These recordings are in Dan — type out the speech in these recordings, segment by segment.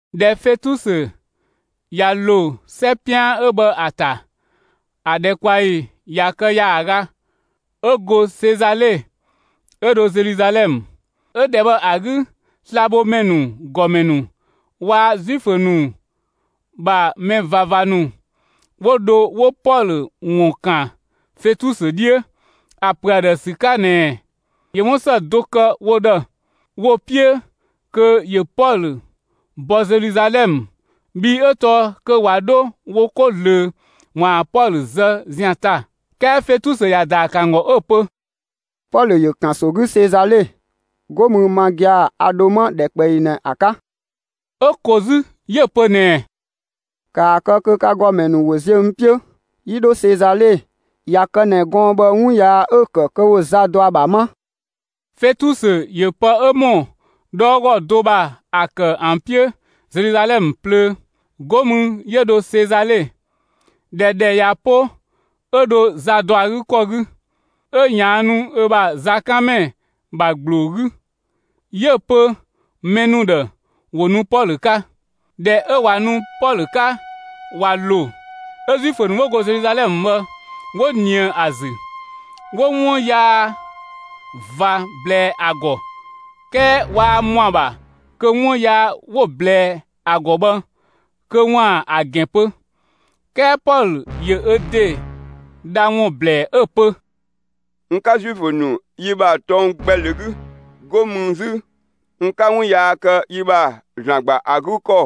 ꞊Dhɛ Fetusö ꞊ya ‑lo 'sɛ 'pian 'ö bhë ‑a ‑ta, ‑a ‑dhɛkpaɔyi ꞊ya kë ‑yaaga, 'ö go Sezale 'ö dho Zeluzalɛmë. 'Ö ‑dhɛ bhë ‑a 'gü slabhomɛ ‑nu ‑gɔmɛ ‑nu, waa‑ Zuifö ‑nu ‑bha mɛ ꞊vava ‑nu 'wo dho 'wo Pɔlö ‑wun ‑kan Fetusö 'dhiö ‑a ‑pö ‑a ‑dhë ‑sü 'ka ꞊nɛɛ ‑yö 'wun ‑së do kë wo ‑dhë, 'wo‑ 'piö kö ‑yö Pɔlö bɔ Zeluzalɛmë; bhii 'ö tɔɔ kö ꞊wa 'dho wo 'ko ꞊zlöö ‑waan Pɔlö zë zian ‑ta. 'Kɛɛ Fetusö ‑ya ‑daa ‑kë ‑an ‑gɔ 'ö‑ pö: «Pɔlö ‑yö ‑kanso 'gü Sezale, 'go mü ma gia‑, a ‑dho 'ma ‑dhɛkpaɔyi ꞊nɛ ‑a 'ka.» 'Ö ko 'zü 'yö‑ pö ꞊nɛɛ: «‑Kaa kë kö ka ‑gɔmɛ ‑nu ‑wo ziö n 'piö, 'yi 'dho Sezale! ꞊Ya kë ꞊nɛ gɔɔn‑ bhë 'wun yaa 'ö‑ ‑kë kö ‑wo za dɔ ‑a ‑bha 'ma!» Fetusö ‑yö pë 'ö ‑mɔ 'dhɔɔgɔ do ‑bha ‑a ‑kë ‑an 'piö Zeluzalɛmë plöö. 'Go mü 'yö dho Sezale. ꞊Dhɛ ‑dhɛ ꞊ya 'po 'ö dho za ‑dɔ ‑a 'gü ‑kɔ 'gü, 'ö ꞊yaannu ö ‑bha zakanmɛ ‑bha ‑gbloo 'gü, 'yö‑ pö mɛ ‑nu ‑dhë ‑wo nu Pɔlö 'ka. ꞊Dhɛ 'ö ꞊wa nu Pɔlö 'ka ꞊wa ‑lo, 'ö Zuifö ‑nu 'wo go Zeluzalɛmë bhë 'wo ꞊nië ‑a ‑zü, 'wo 'wun yaa ꞊va ꞊blɛɛ ‑a ‑gɔ. 'Kɛɛ waa ‑mɔa ‑bha kö 'wun yaa 'wo‑ ꞊blɛɛ ‑a ‑gɔ bhë kö ‑waan ‑a ‑gɛn pö. 'Kɛɛ Pɔlö ‑yö ö ‑de dha ‑wun ‑blɛɛ 'ö‑ pö: «N 'ka Zuifö ‑nu yi ‑bha tɔng gbɛ ‑lö 'gü. 'Go mü 'zü, n 'ka 'wun yaa kë yi ‑bha ‑Zlan ‑gba ‑a 'gü ‑kɔ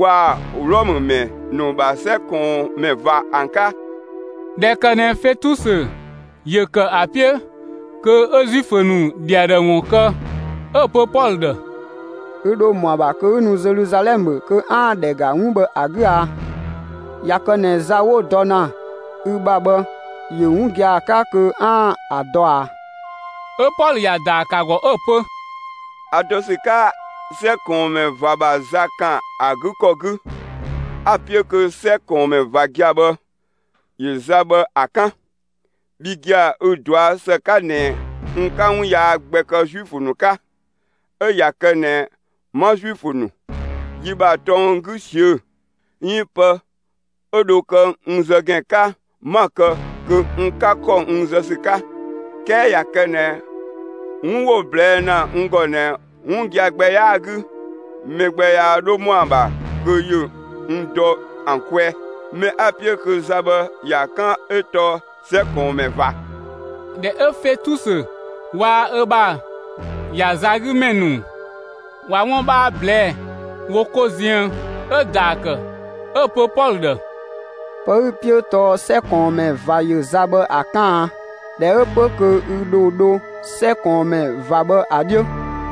waa‑ Wlɔmë ‑mɛ ‑nu ‑bha 'sɛ ꞊kɔɔnmɛ ꞊va ‑an 'ka.» ꞊Dhɛ ‑kë ꞊nɛ Fetusö ‑yö ‑kë ‑a 'piö kö 'ö Zuifö ‑nu ‑dhi ‑a ‑dhë ‑wun kë, 'ö‑ pö Pɔlö ‑dhë: «Ü ‑dho ‑mɔa ‑bha kö 'ü nu Zeluzalɛmë kö 'aan‑ ‑dhɛ ‑ga 'wun bhë ‑a 'gü a? ꞊Ya kë ꞊nɛ za 'wo‑ dɔ ‑na ü ‑bha bhë ‑yö 'wun gia‑ 'ka kö 'aan‑ ‑a dɔ ꞊a?» 'Ö Pɔlö ‑ya ‑daa ‑kë 'ö‑ pö: «A dɔ ‑sü 'ka 'sɛ ꞊kɔɔnmɛ ꞊va ‑bha za ‑kan ‑a 'gü ‑kɔ 'gü; 'a‑ 'piö kö 'sɛ ꞊kɔɔnmɛ ꞊va gia‑ bhë ‑yö za bhë ‑a 'kan. Bhi gia‑ ü‑ ꞊dɔa' ‑së 'ka ꞊nɛ n 'ka 'wun yaa gbɛ kë Zuifö ‑nu 'ka. 'Ö ꞊ya kë ꞊nɛ 'ma Zuifö ‑nu, yi ‑bha tɔng 'gü ꞊siö'‑, 'iin pë 'ö dho kë n zë ‑gɛn 'ka, 'ma‑ kë kö n 'ka ‑kɔ n zë ‑sü 'ka. 'Kɛɛ ꞊ya kë ꞊nɛ 'wun 'wo‑ ꞊blɛɛ' ‑na n ‑gɔ ꞊nɛ, 'wun gia‑ gbɛ 'yaa‑ 'gü, mɛ gbɛ yaa 'dho ‑mɔa ‑bha kö ‑yö n dɔ ‑an kwɛɛ. Mɛ 'a‑ 'piö kö za bhë ‑ya 'kan 'ö tɔɔ 'sɛ ꞊kɔɔnmɛ ꞊va.» ꞊Dhɛ 'ö Fetusö waa‑ ö ‑bha ‑ya za 'gü ‑mɛ ‑nu ꞊wa 'wun 'bhaa ꞊blɛɛ'‑ wo 'ko ziën, 'ö‑ ‑daa ‑kë 'ö‑ pö Pɔlö ‑dhë: «Pë 'ü‑ 'piö 'ö tɔɔ 'sɛ ꞊kɔɔnmɛ ꞊va ‑yö za bhë ‑a 'kan a? ꞊Dhɛ 'ö 'pö kö ü ‑dho dho 'sɛ ꞊kɔɔnmɛ ꞊va bhë ‑a 'dhiö.»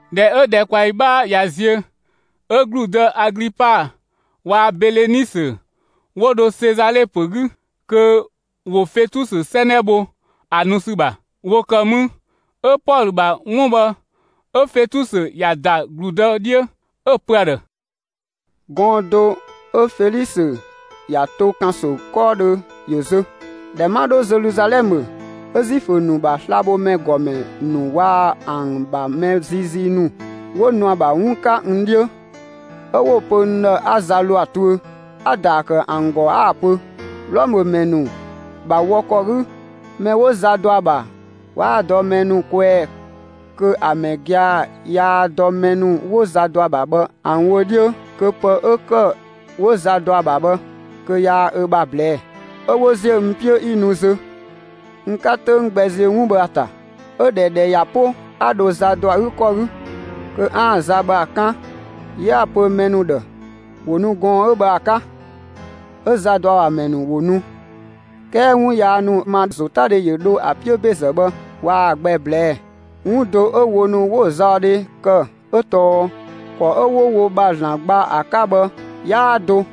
꞊Dhɛ 'ö ‑dhɛkpaɔyi 'bhaa ꞊ya ziö, 'ö ‑gludë Aglipa waa‑ Belenisö 'wo dho Sezale ‑pö 'gü kö ‑wo Fetusö 'sɛnɛ bho ‑a nu ‑sü ‑bha. ‑Wo ‑kë mü, 'ö Pɔlö ‑bha 'wun bhë, 'ö Fetusö ‑ya ‑da ‑gludë 'dhiö, 'ö‑ pö ‑a ‑dhë: «Gɔɔn‑ do 'ö Felisö ‑ya to ‑kanso 'kɔɔdhö ‑yö zö. ꞊Dhɛ 'ma 'dho Zeluzalɛmë, 'ö Zuifö ‑nu ‑bha slabhomɛ ‑gɔmɛ ‑nu waa‑ ‑an ‑bha mɛ ziizii ‑nu 'wo nu ‑a ‑bha 'wun 'ka n 'dhiö. 'Ö 'wo‑ pö n ‑dhë 'a za ‑lo ‑a tuö. A‑ ‑daa ‑kë ‑an ‑gɔ 'a‑ pö: ‹Wlɔmë ‑mɛ ‑nu ‑bha wɔ ‑kɔ 'gü, mɛ 'wo za dɔ ‑a ‑bha, 'waa‑ dɔ mɛ ‑nu kwɛɛ kö ‑a mɛ gia‑ yaa dɔ mɛ ‑nu 'wo za dɔ ‑a ‑bha bhë ‑an wö 'dhiö, kö pë 'ö ‑kë 'wo za dɔ ‑a ‑bha bhë kö yaa ö ‑bha ꞊blɛɛ'‑.› 'Ö 'wo ‑ziö n 'piö 'yi nu zö; n 'ka 'töng gbɛ ziö 'wun bhë ‑a ‑ta. 'Ö ꞊dhɛ ‑dhɛ ꞊ya 'po, 'a dho za ‑dɔ ‑a 'gü ‑kɔ 'gü kö 'aan‑ za bhë ‑a 'kan. 'Yö 'a‑ pö mɛ ‑nu ‑dhë ‑wo nu gɔɔn‑ 'ö bhë ‑a 'ka. 'Ö za ‑dɔ ‑a ‑bha ‑mɛ ‑nu ‑wo nu, 'kɛɛ 'wun yaa ‑nu 'ö n ‑ma ‑zotadhe ‑yö dho ‑an 'piö ‑bezë bhë waa‑ gbɛ ꞊blɛɛ'‑. 'Wun do 'ö wo ‑nu 'wo‑ zaɔdhe kë 'ö tɔɔ ‑kɔ 'ö 'wo wo ‑bha ‑Zlan gba ‑a 'ka bhë 'yaa do.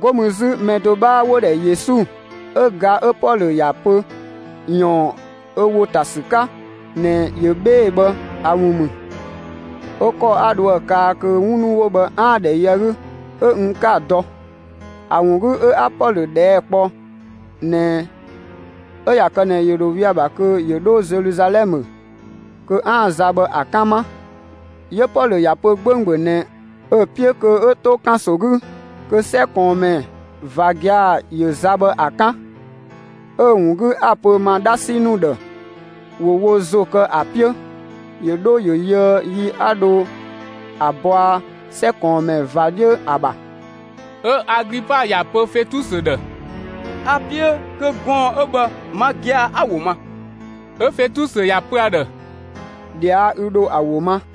'Go mü 'zü, mɛ do 'bhaa 'wo‑ ‑dhɛ Yesu 'ö ga 'ö Pɔlö ‑ya pö ꞊yɔɔn ö ‑wo ‑ta ‑sü 'ka ꞊nɛ ‑yö 'bhee‑ bhë ‑a ‑wun ‑mü. 'Ö ‑kɔ 'a dho ‑a kaa kö 'wun ‑nu 'wo bhë 'aan‑ ‑dhɛ yö ‑an 'gü 'ö n 'ka‑ dɔ. ‑A ‑wun 'gü 'ö 'a Pɔlö ꞊dhɛɛ' kpɔ ꞊nɛ 'ö ꞊ya kë ꞊nɛ ‑yö ‑dho 'we‑ ‑bha kö ‑yö 'dho Zeluzalɛmë kö 'aan‑ za bhë ‑a 'kan 'ma. 'Yö Pɔlö ‑ya pö 'gbönggböng ꞊nɛ ö‑ 'piö kö 'ö to ‑kanso 'gü kö 'sɛ ꞊kɔɔnmɛ ꞊va gia‑ ‑yö za bhë ‑a 'kan. 'Ö‑ ‑wun 'gü, 'a‑ pö n ‑ma 'dhasi ‑nu ‑dhë, ‑wo wo ‑zo kë ‑a 'piö, ‑yö 'dho ‑yö yöë yi 'a dho ‑a bɔa 'sɛ ꞊kɔɔnmɛ ꞊va 'dhiö ‑a ‑bha.» 'Ö Aglipa ‑ya pö Fetusö ‑dhë: «A‑ 'piö kö gɔɔn‑ 'ö bhë, ma gia‑ 'a‑ ‑wo ma.» 'Ö Fetusö ‑ya pö ‑a ‑dhë: «꞊Dhia' 'ü dho ‑a ‑wo ma.»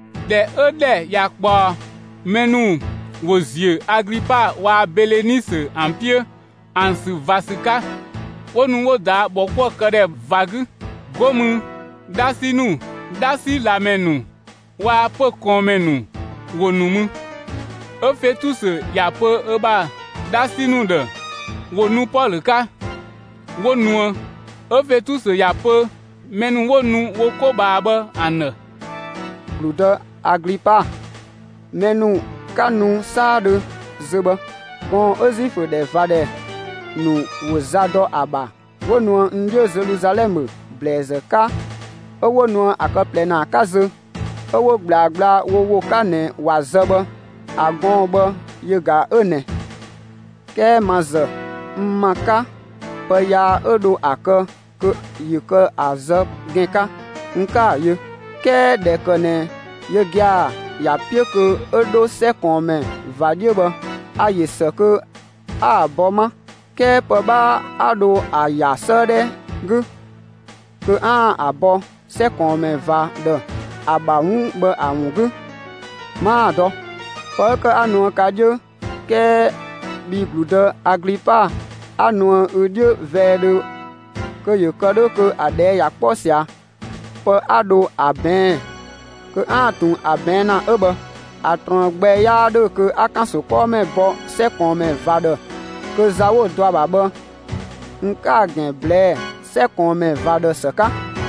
꞊Dhɛ 'ö‑ ‑dhɛ ꞊ya ꞊kpaɔ, mɛ ‑nu ‑wo ‑ziö Aglipa waa‑ Belenisö ‑an 'piö ‑an ‑sü ꞊va ‑sü 'ka, 'wo nu 'wo ꞊daa' ‑bhɔkuëkëdhɛ ꞊va 'gü. 'Go mü 'dhasi ‑nu, 'dhasi ꞊lamɛ ‑nu waa‑ pö‑ ꞊kɔɔnmɛ ‑nu ‑wo ‑nu mü. 'Ö Fetusö ‑ya pö ö ‑bha 'dhasi ‑nu ‑dhë ‑wo nu Pɔlö 'ka; 'wo nuë. 'Ö Fetusö ‑ya pö mɛ ‑nu 'wo nu wo 'ko ꞊bhaa bhë ‑an ‑dhë: «‑Gludë Aglipa, mɛ ‑nu 'ka nu 'saadhö zö bhë, gɔɔn‑ 'ö Zuifö ‑dhɛ ꞊va ‑dhɛ ‑nu ‑wo za dɔ ‑a ‑bha 'wo nuë n 'dhiö Zeluzalɛmë ‑blɛɛzë 'ka, 'ö 'wo nuë ‑a kë ꞊plɛ ‑naa 'ka zö, 'ö 'wo ꞊gblaa gbla wo ‑wo 'ka ꞊nɛ ‑wa zë bhë, ‑a gɔɔn‑ bhë yö ꞊ga 'ö ꞊nɛ. 'Kɛɛ ma ‑zë, n ‑ma 'ka, pë yaa 'ö dho ‑a kë kö ‑yö kë ‑a zë ‑gɛn 'ka, n 'ka‑ yö. 'Kɛɛ ꞊dhɛ ‑kë ꞊nɛ yö gia‑ ‑ya 'piö kö 'ö 'dho 'sɛ ꞊kɔɔnmɛ ꞊va 'dhiö bhë, a‑ ‑yö ‑së kö 'a‑ bɔ 'ma. 'Kɛɛ pë 'bhaa 'a dho ‑a ‑ya 'sëëdhɛ 'gü kö 'aan‑ ‑a bɔ 'sɛ ꞊kɔɔnmɛ ꞊va ‑dhë, ‑a ‑bha 'wun 'ö bhë ‑a ‑wun 'gü 'maa‑ dɔ. Pë 'ö ‑kë 'a nuë ka 'dhiö, 'kɛɛ bhi ‑gludë Aglipa, 'a nuë ü 'dhiö vɛɛdhö kö ‑yö kë 'dhö kö ‑a ꞊dhɛɛ' ꞊ya 'kpɔ ꞊sia, pë 'a dho ‑a ꞊bɛɛn'‑, kö 'aan‑ ꞊tun ‑a ꞊bɛɛn' ‑na 'ö bhë. ‑A ꞊truën gbɛ 'yaa ‑dhö kö 'a ‑kanso 'kɔɔmɛ bɔ 'sɛ ꞊kɔɔnmɛ ꞊va ‑dhë kö za 'wo‑ dɔ ‑a ‑bha bhë, n 'ka‑ ‑gɛn ꞊blɛɛ'‑ 'sɛ ꞊kɔɔnmɛ ꞊va ‑dhë ‑së 'ka.»